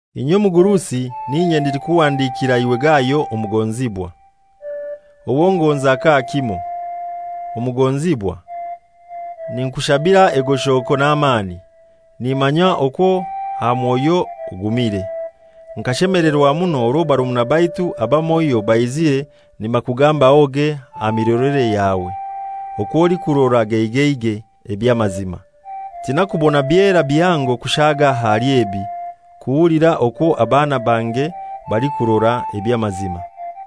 Inye omugurusi n'inye ndikukuhandikira iwe Gayo omugonzibwa, owo ngonza kakimoi. Omugonzibwa, ninkushabira egoshoko n'amani. Nimanya okwo aha mwoyo ogumire. Nkashemelerwa muno orwo barumuna baitu abamoi baizire nibakugambahoge aha mirolere yawe, okw'olikurora geigeigei eby'amazima. Tinaikubona byera bihango kushaaga ahali ebi, kuhulira okwo abaana bange balikukora eby'amazima.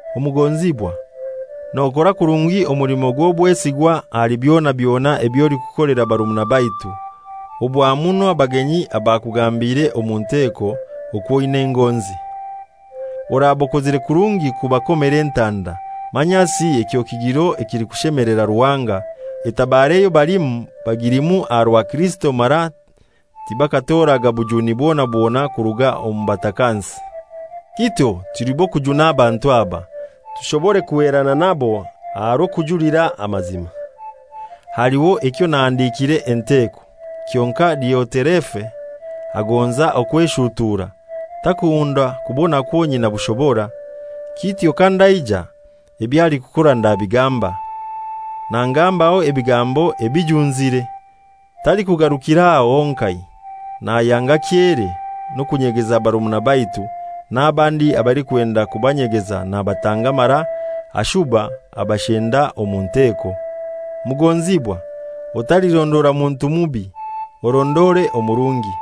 Omugonzibwa, nokora kurungi omulimo gw'obwesigwa ahali byona byona eby'olikukolera barumuna baitu, obwa muno abagenyi abakugambiire omu nteko okw'oina engonzi. Oraba okozire kurungi kubakomera entanda, manyasi ekyo kigiro ekilikushemelera Ruhanga. Etabaro eyo balimu bagilimu aha rwa Kirisito mara tibakatoraga bujuni bwona bwona kuruga omu batakansi. Kityo tuli b'okujuna abantu aba, tushobore kuhwerana nabo aha aha rw'okujulira amazima. Haliho ekyo nahandikiire enteko; kyonkai Dioterefe agonza okweshutuura, takunda kubonakwo nyina bushobora. Kityo kandaija, ebyo alikukora ndabigamba. Nangambaho ebigambo ebijunzire. Talikugarukir'aho honkai. Nayanga kyere n'okunyegeza barumuna baitu, n'abandi abalikwenda kubanyegeza nabatanga mara ashuba abashenda omu nteko. Mugonzibwa, otalirondora muntu mubi, orondore omurungi.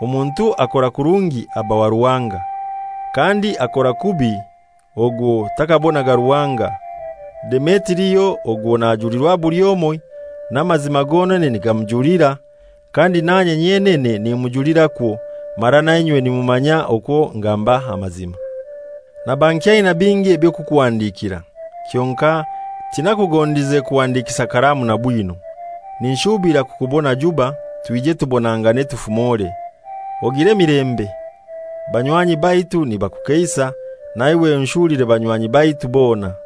Omuntu akora kurungi aba wa Ruhanga; kandi akora kubi ogwo takabonaga Ruhanga. Demetirio ogwo najulirwa buli omoi, n'amazima gonene nigamujulira, kandi nanye nyenene nimujulirakwo, mara nainywe nimumanya okwo ngamba amazima. Naba nkyaina bingi eby'okukuhandikira, kyonkai tinakugondize kuhandikisa kalamu na bwino. Ninshuubira kukubona juba, twije tubonangane tufumore. Ogire emilembe. Banywanyi baitu nibakukeisa. Naiwe onshulire banywanyi baitu bona.